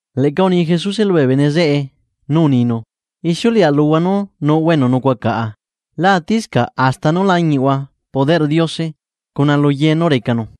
Leꞌca uni Jesuse lubee bene zeꞌe nú uninu: ―Ixiuleꞌa luhua nú nuꞌhua enu nucuaꞌa caꞌa lá atiscaꞌ hasta nú lañiꞌhua poderꞌ Diose cuna lu ye nú recanu.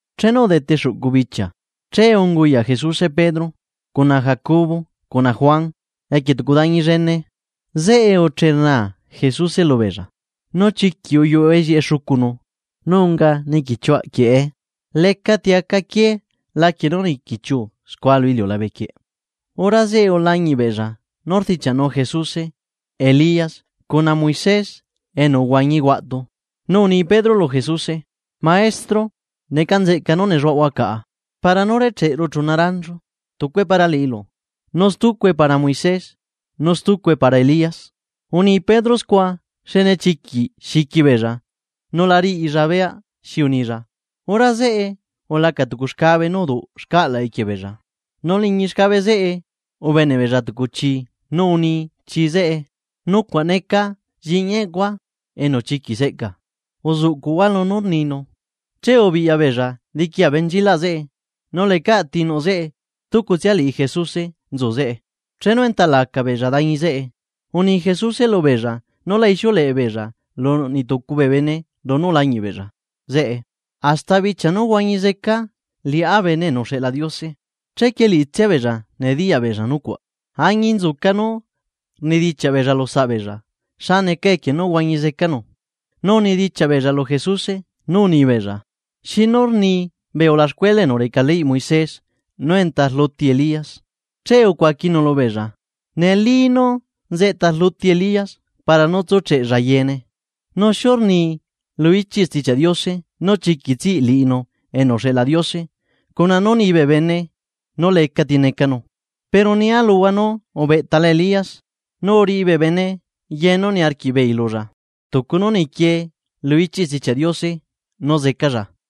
Chenu udete xuꞌcu bichia, che unguyaꞌ Jesuse Pedro, cuna Jacobo cuna Juan. Equie tucu dañi llene, zeꞌe ucheꞌe nú rnaa Jesuse lubeella. Nu chiquiꞌ uyuꞌullieꞌe xucunu nu unga niquichiuaꞌquieꞌe nu lecati aca quié laquie nú niquichiu scua lu iliulabequieꞌ. Hora zeꞌe ulañiꞌ beella nú rdichiaꞌnu Jesuse, Elías cuna Moisés enu uhuañi huaꞌtu. Nu uni Pedro lu Jesuse: ―Maestro, ¡neca nzeꞌca nú nelluaꞌhua caꞌa! Para nú recheꞌeru chuna ranchu: tucue para liꞌilu, nu stucue para Moisés, nu stucue para Elías. Uni Pedro scua xne chiquiꞌ xiqui beella, nu la riꞌilla beyaꞌ xi unilla. Hora zeꞌe, ulaca tucu xcabe nú uduꞌ xcaꞌlaꞌ equie beella. Nu liñi xcabe zeꞌe, ubeneꞌ beella tucu chi nu uni chi zeꞌe: ―Neca nucuaꞌ lliꞌñia enu chiquiꞌ seꞌcaa, uzuꞌcuꞌhua lunú rninu. Che ubiꞌya beella diqui abenchilaꞌ zeꞌe, nu lecaꞌ tinuꞌ zeꞌe stucu liꞌtsia Jesuse nzu zeꞌe. Chenu enta laca beella dañi zeꞌe, uni Jesuse lubeella nú la ixiuleꞌe beella lu niꞌtucu bee bene lunú ulañiꞌ beella zeꞌe, hasta bichia nú huañi zeca Liꞌá Bene enu uxeꞌla Diose. Chequie liꞌitsia beella nediyaꞌ beella nucuaꞌ, añinzuca nú rnidichiaꞌ beella lu saꞌa beella xa neca equie nú huañi zecanu. Nu unidichiaꞌ beella lu Jesuse nú unibeella: ―¿Xi nú rni bee ulaxcuela enu reca leyꞌ Moisés nú enta rluti Elías? Che ucuaquinu lubeella: ―Neli nú nzeꞌta rluti Elías, para nú tsúcheꞌella yeene. ¿Nu xinu rni lu ichiꞌ Stichiaꞌ Diose nú chiquiꞌ nehuana zeca liꞌinu enu uxeꞌla Diose cuna nú nibee bene nú lecati necanu? Pero nia luhua nú ubeꞌtala Elías, nu uriꞌi bee bene ye nú niarquiꞌbeei lulla, tucu nú niquie lu ichiꞌ Stichiaꞌ Diose nú zecalla.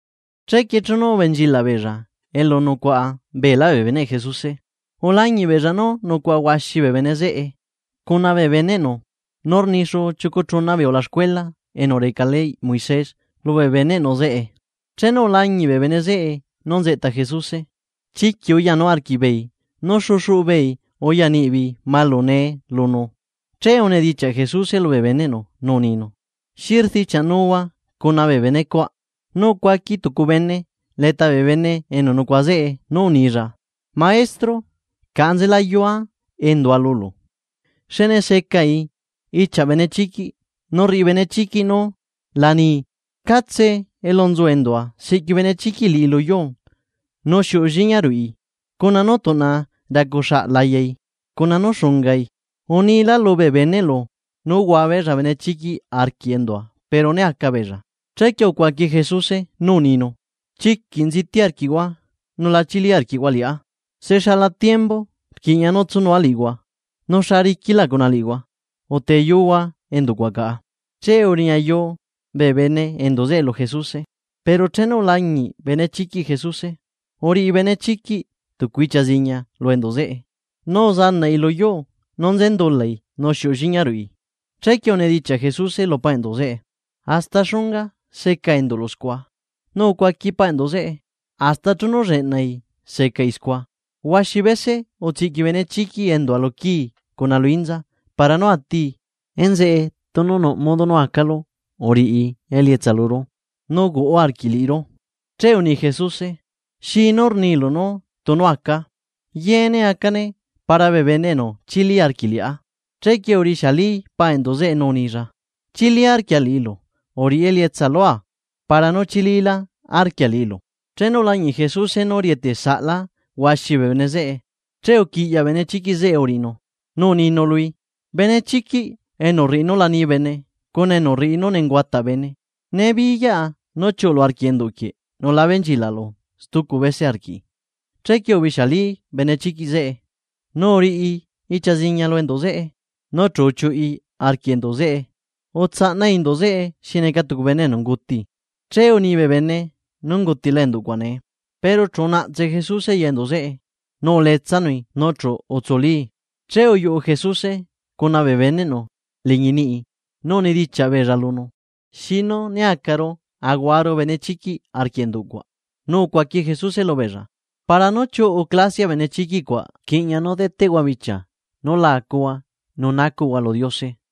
Chequie chenu ubenchilaꞌ beella elu nucuaꞌa beelá bee beneꞌ Jesuse, ulañiꞌ beella nú nucuaꞌa huaxi bee bene zeꞌe, cuna bee beneꞌnu nu rni xuu chiucu chuna bee ulaxcuela enu reca leyꞌ Moisés lubee beneꞌnu zeꞌe. Chenu ulañiꞌ bee bene zeꞌe nú nzeꞌta Jesuse, chiquiꞌ uyanu arquiꞌbeei nu xexuꞌu beei uya niꞌbeei malune lunu. Che unidichiaꞌ Jesuse lubee beneꞌnu nú uninu: ―¿Xi rdichiaꞌnuhua bee benecuaꞌ? Nu ucuaqui tucu bene leta bee bene enu nucuaꞌa zeꞌe nú unilla: ―Maestro, caꞌa nzelayua endua lulu, xne secai ichiaꞌ benechiquiꞌ nu rriꞌi benechiquiꞌ nu la nii. Catse elu nzu endua, siꞌqui benechiquiꞌ liꞌi lu yuu nu xiuꞌu lliña ruꞌi, cuna nú tuꞌna racu xaꞌlayai cuna nú xungai. Unia lubee beneꞌlu nú huabeella benechiquiꞌ arquiꞌ endua pero né aca beella. Chequie ucuaqui Jesuse nú uninu: ―¡Chiquiꞌ nziti arquiꞌhua nu la chili arquiꞌhua liꞌá! ¿Se xala tiembu rquiꞌña nú tsunua liꞌihua? ¿Nu xa riquilá cuna liꞌihua? Uteyuhua enduꞌ cuaꞌ caꞌa. Che uriñayu bee bene enduꞌ zeꞌe lu Jesuse. Pero chenu ulañiꞌ benechiquiꞌ Jesuse, uriꞌi benechiquiꞌ tucu ichia ziña lu enduꞌ zeꞌe, nu uzanaꞌi lu yuu nu nzendulai nu xiuꞌu lliña ruꞌi. Chequie unidichiaꞌ Jesuse lu paꞌ enduꞌ zeꞌe: ―¿Hasta xunga seca enduꞌlu scua? Nu ucuaqui paꞌ enduꞌ zeꞌe: ―Hasta chenu lleꞌnai secai scua. Huaxi bese utsiꞌqui benechiquiꞌ endua luquii cuna lu inza, para nú atii. Enzeꞌe tunu nuꞌ modo nú acalu uriꞌi elietsa luru, nu uhuaꞌa arquiꞌ liꞌiru. Che uni Jesuse: ―¿Xinú rnilu tunu acaa? ¡Yeene acane para bee bene enu chili arquiꞌ liꞌá! Chequie urixiali paꞌ enduꞌ zeꞌe nú unilla: ―Chili arquia liꞌilu. ¡Uriꞌi elietsa lua para nú chililá arquia liꞌilu! Chenu ulañiꞌ Jesuse nú rieteꞌsaꞌlá huaxi bee bene zeꞌe, che uquiꞌyaꞌ benechiquiꞌ zeꞌe uriꞌinu, nu uninu lui: ―Benechiquiꞌ enu rriꞌi nú la nii bene cuna nú rriꞌi nú nenguataꞌ bene, nibiyaꞌa nú chiuꞌulu arquiꞌ enduꞌ quieꞌ nu la benchilaꞌlu stucu bese arquiꞌi. Chequie ubixialí benechiquiꞌ zeꞌe, nu uriꞌi ichia ziñia lu enduꞌ zeꞌe. Nu chu uchiuꞌi arquiꞌ enduꞌ zeꞌe, utsaꞌnai endu zeꞌe xi neca tucu bene enu unguti, che uni bee bene nú ungutila enduꞌ cuaꞌ nee. Pero chu unaꞌtse Jesuse ya enduꞌ zeꞌe, nu uletsanui nu chu utsulii. Che uyuꞌu Jesuse cuna bee beneꞌnu liñi niꞌi, nu unidichiaꞌ beella lunu: ―¿Xinu né acaru ahuaru benechiquiꞌ arquiꞌ enduꞌ cuaꞌ? Nu ucuaqui Jesuse lubeella: ―Para nú chiuꞌu clasiaꞌ benechiquiꞌ cuaꞌ rquiꞌña nú deteꞌhua bichia nú la acuhua nu nacuꞌhua lu Diose.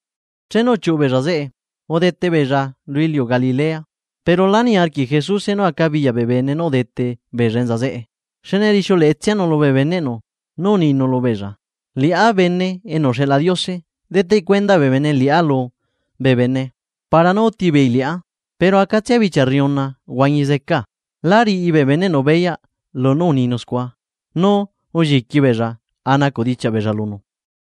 Chenu uchiuꞌu beella zeꞌe, udete beella lu iliu Galilea. Pero la niarquiꞌ Jesuse nú acabiyaꞌ bee bene nú udete beella enza zeꞌe, xne rixiuleꞌetsianu lubee beneꞌnu nú uninu lubeella: ―Liꞌá Bene enu uxeꞌla Diose deteꞌ cuenda bee bene liꞌá lubee bene, para nú úti beei liꞌá, pero acatsia bichia rriuna huañi zecaa. Lá riꞌi bee beneꞌnu beyaꞌ lunú uninu scua, nu ulliqui beella a nacuꞌ dichiaꞌ beella lunu.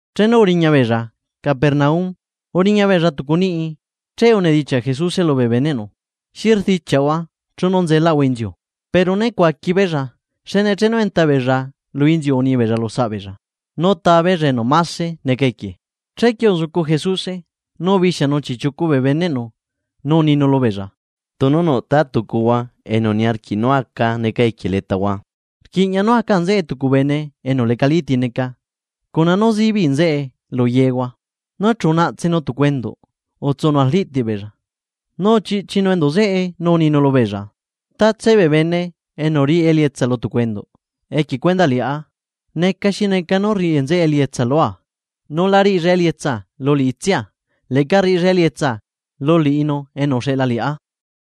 Chenu uriña beella Capernaum. Uriña beella tucu niꞌi, che unedichiaꞌ Jesuse lubee beneꞌnu: ―Xi rdichiaꞌhua chenu nzelaꞌahua lu inziu. Pero ne cuaqui beella, xne chenu enta beella lu inziu unibeella lu saꞌa beella nú taa beella enu máse neca equie. Chequie uzucu Jesuse, nu ubixianu chiꞌchiucu bee beneꞌnu nu uninu lubeella: ―Tunu nuꞌta tucuhua enu niarquiꞌ nú aca neca equie letahua, rquiꞌña nú aca nzeꞌe tucu bene enu lecati neca cuna nú zibiꞌ nzeꞌe lu yehua. Nu chu unaꞌtsenu tucu enduꞌ utsunu labe beella, nu uchiꞌchinu enduꞌ zeꞌe nu uninu lubeella: ―Tatse bee bene enu riꞌi elietsa lu tucu enduꞌ equie cuendaꞌ liꞌá, neca xi neca nú rriꞌi nzeꞌe elietsa lua, nu la riꞌilla elietsa lu liꞌitsia, leꞌca rriꞌilla elietsa lu liꞌinu enu uxeꞌla liꞌá.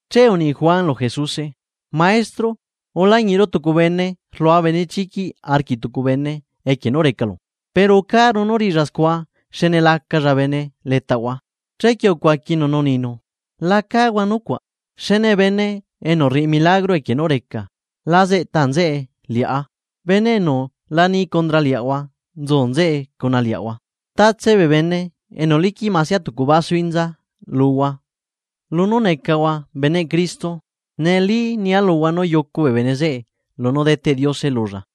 Che uni Juan lu Jesuse: ―Maestro, ulañiꞌru tucu bene rlua benechiquiꞌ arquiꞌ tucu bene equie nú recalu, pero ucaru nú riꞌilla scua xne la acalla bene letaꞌahua. Chequie ucuaquinu nú uninu: ―La cáhua nucuaꞌ, xne bene enu rriꞌi milagro equie nú recaa la zeꞌta nzeꞌe liꞌá. Bene enu lani condra liaꞌahua, nzu nzeꞌe chuaꞌahua. Tatse bee bene enu liquiꞌ masia tucu basu inza luhua lunú necahua beneꞌ Cristo, neli nia luhua nú yucu bene zeꞌe lunú deteꞌ Diose lulla.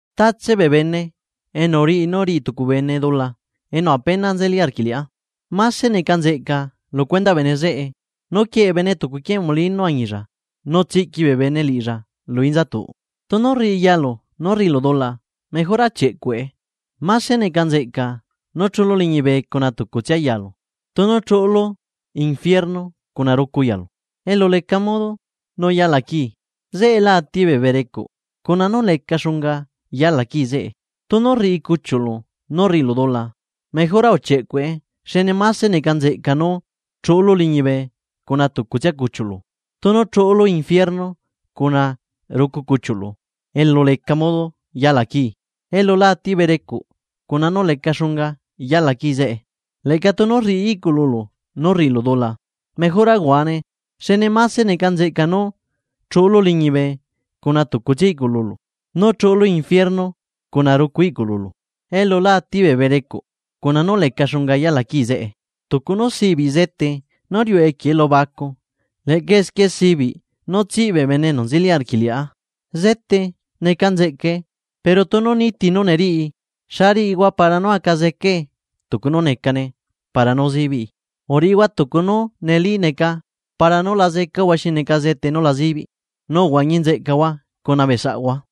’Tatse bene enu riꞌi nú riꞌi tucu bene dula enu apenatsia nzeli arquiꞌ liꞌá, máse neca nzeꞌca lu cuendaꞌ bene zeꞌe nú quieꞌe bene tucu quiee molino añilla nu tsiꞌqui bee bene liꞌilla lu inzatuꞌ. Tunu rriꞌi yalu nú rriꞌilu dula, mejora uchieꞌcuꞌe, máse neca nzeꞌca nú chuꞌulu liñibe cuna tucutsia yalu, tunu chuꞌulu ebila cuna rucu yalu, elu leca modo nú yala quii. Zeꞌe la ati bee berecuꞌ, cuna nú leca xunga yala quii zeꞌe. Tunu rriꞌi cuchiuꞌlu nú rriꞌilu dula, mejora uchieꞌcuꞌe xne máse neca nzeꞌca nú chuꞌulu liñibe cuna tucutsia cuchiuꞌlu, tunu chuꞌulu ebila cuna rucu cuchiuꞌlu elu leca modo nú yala quii. Elu la ati bee berecuꞌ nu leca xunga yala quii zeꞌe. Leꞌca tunu rriꞌi iꞌcululu nú rriꞌilu dula, mejora uhuane, xne máse neca nzeꞌca nú chuꞌlu liñibe cuna tucutsia iꞌcuꞌlulu, nú chuꞌulu ebila cuna rucu iꞌcuꞌlulu, elu la ati bee berecuꞌ nu leca xunga yala quii zeꞌe. ’Tucu nú sibiꞌ zete nú riuꞌe equie elubacu leꞌca esquie sibiꞌ nú nehuana zeca bee bene enu nzeli arquiꞌ liꞌá. Zete neca nzeꞌcae; pero tunu niti nú neriꞌi, ¿xa riꞌihua para nú aca zecae tucu nú necane para nú zibiꞌi? Uriꞌihua tucu nú neli neca para nú la zecahua xi neca zete nú la zibiꞌ, nu uhuañi nzeꞌcahua cuna bee saꞌhua.